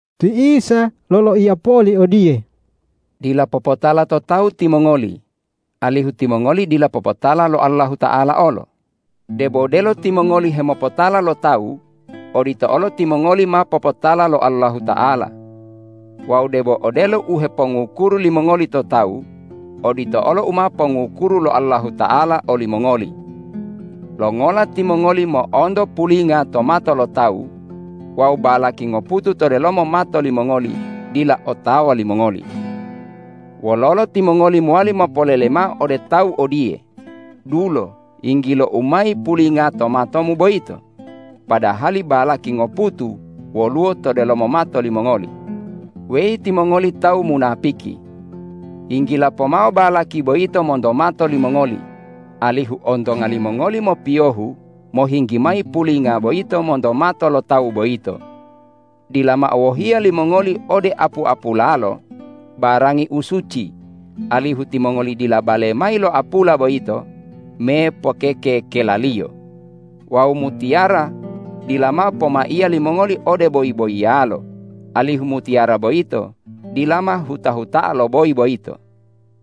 Ti Isa loloiya poli odiye,”Dila popotala to tawu timongoli, alihu timongoli dila popotala lo Allahuta'ala olo. Debo delo timongoli hemopotala lo tawu, odito olo timongoli ma popotala lo Allahuta'ala. Wawu debo odelo u hepongukuru limongoli to tawu, odito olo u ma pongukuru lo Allahuta'ala olimongoli. Longola timongoli mo'onto pulinga to mato lo tawu wawu balaki ngoputu to delomo mato limongoli dila otawa limongoli? Wololo timongoli mowali mopolele mao ode tawu odiye, ’Dulo, yinggilou mayi pulinga to matomu boyito,’ padahali balaki ngoputu woluwo to delomo mato limongoli? Weyi timongoli tawu munapiki! Yinggila pomao balaki boyito monto mato limongoli, alihu ontonga limongoli mopiyohu mohinggi mayi pulinga boyito monto mato lo tawu boyito. Dila mao wohiya limongoli ode apu-apulalo, barangi u suci, alihu timongoli dila bale mayi lo apula boyito me pokeke-kelaliyo. Wawu mutiyara dila mao pomaiya limongoli ode boyi-boyiyalo, alihu mutiyara boyito dila ma huta-huta'a lo boyi boyito.”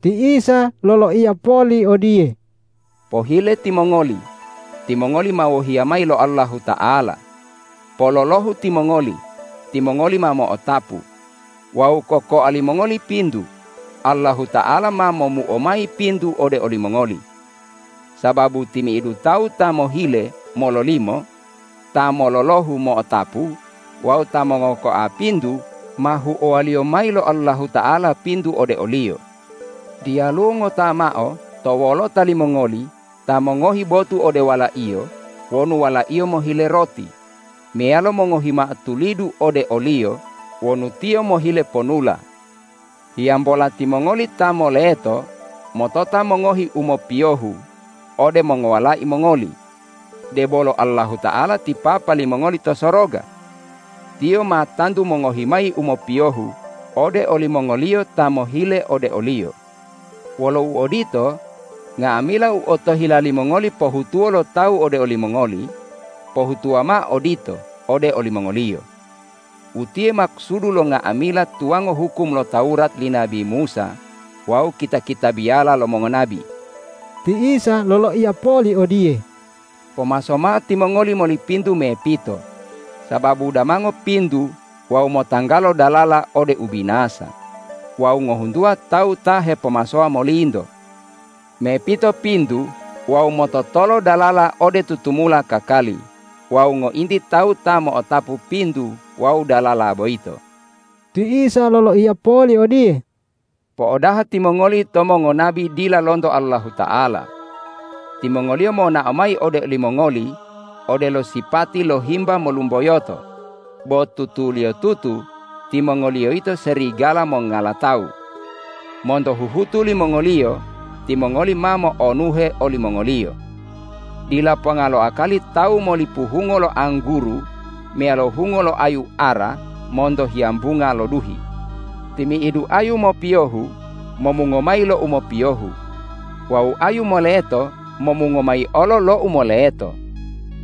Ti Isa loloiya poli odiye,”Pohile timongoli, timongoli ma wohiya mayi lo Allahuta'ala; pololohu timongoli, timongoli ma mo'otapu; wawu kokoa limongoli pintu, Allahuta'ala ma momuo mayi pintu ode olimongoli. Sababu timi'idu tawu ta mohile, mololimo; ta mololohu, mo'otapu wawu ta mongokoa pintu ma huowaliyo mayi lo Allahuta'ala pintu ode oliyo. Diyaluwo ngota mao to wolota limongoli ta mongohi botu ode walaiyo wonu walaiyo mohile roti meyalo mongohi mao tulidu ode oliyo wonu tiyo mohile ponula. Hiyambola timongoli ta moleto motota mongohi u mopiyohu ode mongowalai mongoli, debolo Allahuta'ala ti Papa limongoli to soroga. Tiyo ma tantu mongohi mayi u mopiyohu ode olimongoliyo ta mohile ode o-Liyo. Wolo uodito, nga'amila u otohila limongoli pohutuwo lo tawu ode olimongoli, pohutuwa mao odito ode olimongoliyo. Utiye makusudu lo nga'amila tuwango hukum lo Tawurat li nabi Musa wawu kita-kitabiyala lo mongonabi.” Ti Isa loloiya poli odiye,”Pomaso mao timongoli moli pintu mepito, sababu damango pintu wawu motanggalo dalala ode ubinasa wawu ngohuntuwa tawu ta hepomasowa molinto. Mepito pintu wawu mototolo dalala ode tutumula kakali wawu ngointi tawu ta mo'otapu pintu wawu dalala boyito.” Ti Isa loloiya poli odiye,”Po'odaha timongoli to mongonabi dila lonto Allahuta'ala. Timongoliyo monao mayi ode olimongoli odelo sipati lo himba molumboyoto, bo tutuliyotutu timongoliyo yito serigala mongala tawu. Monto huhutu limongoliyo timongoli ma mo'onuhe olimongoliyo. Dila ponga lo akali tawu molipu hungo lo angguru meyalo hungo lo ayu ara monto hiyambunga lo duhi. Timi'idu ayu mopiyohu momungo mayi lo u mopiyohu wawu ayu moleto momungo mayi olo lo u moleto.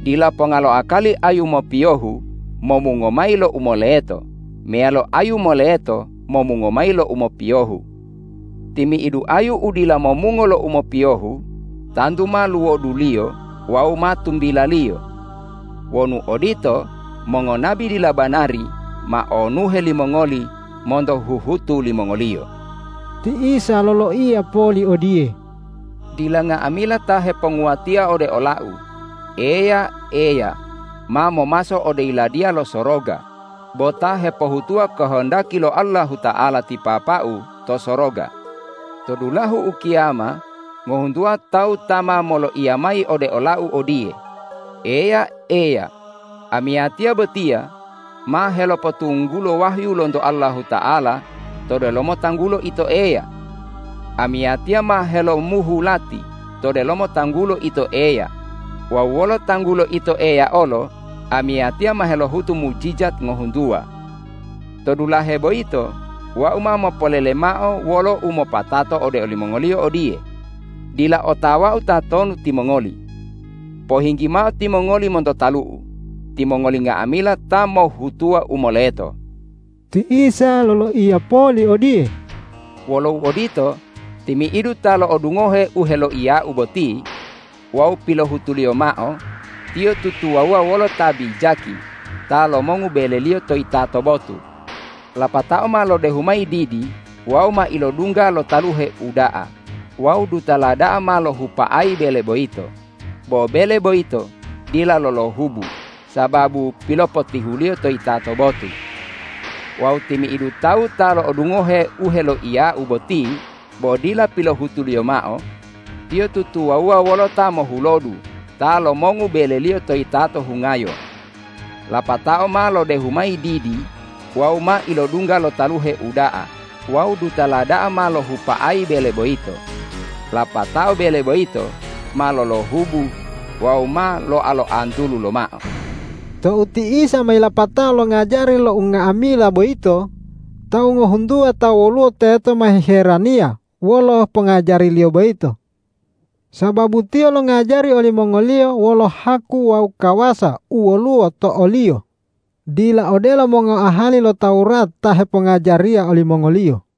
Dila ponga lo akali ayu mopiyohu momungo mayi lo u moleto meyalo ayu moleto momungo mayi lo u mopiyohu. Timi'idu ayu u dila momungo lo u mopiyohu tantu ma luwoduliyo wawu ma tumbilaliyo. Wonu odito, mongonabi dila banari ma onuhe limongoli monto huhutu limongoliyo.” Ti Isa loloiya poli odiye,”Dila nga'amila ta heponguwatia ode ola-U, ’Eya, Eya,’ ma momaso ode Yiladiya lo Soroga bo ta hepohutuwa kohondaki lo Allahuta'ala ti Papa-U to soroga. To dulahu ukiyama ngohuntuwa tawu ta ma moloiya mayi ode ola-U odiye, ’Eya, Eya, amiyatiya botiya ma helopotunggulo wahyu lonto Allahuta'ala to delomo tanggulo Ito Eya. Amiyatiya ma helomuhu lati to delomo tanggulo Ito Eya wawu wolo tanggulo Ito Eya olo amiyatiya ma helohutu mujijat ngohuntuwa.’ To dulahe boyito Wau ma mopolele mao wolo umopatato ode olimongoliyo odiye, ’Dila otawa-U tatonu timongoli. Pohinggi mao timongoli monto talu-U, timongoli nga'amila ta mohhutuwa u moleto!’” Ti Isa loloiya poli odiye,”Wolo uodito, timi'idu ta lo'odungohe u heloiya-U boti wawu pilohutuliyo mao, tiyo tutuwawuwa wolo ta bijaki ta lomongu beleliyo to yitato botu. Lapatao ma lodehu mayi didi wawu ma ilodungga lo taluhe uda'a wawu dutala da'a ma lohupa'ayi bele boyito, bo bele boyito dila lolohubu sababu pilopotihuliyo to yitato botu. Wawu timi'idu tawu ta lo'odungohe u heloiya-U boti bo dila pilohutuliyo mao, tiyo tutuwawuwa wolo ta mohulodu ta lomongu beleliyo to yitato hungayo. Lapatao ma lodehu mayi didi wawu ma ilodungga lo taluhe uda'a wawu dutala da'a ma lohupa'ayi bele boyito, lapatao bele boyito ma lolohubu wawu ma loa-loantulu lomao.” Tou ti Isa ma yilapato longajari lo unga'amila boyito, tawu ngohuntuwa ta woluwo teto ma hiheraniya wolo pongajari-Liyo boyito. Sababu Tiyo longajari olimongoliyo wolo haku wawu kawasa u woluwo to o-Liyo, dila odelo mongoahali lo Tawurat ta hepongajariya olimongoliyo.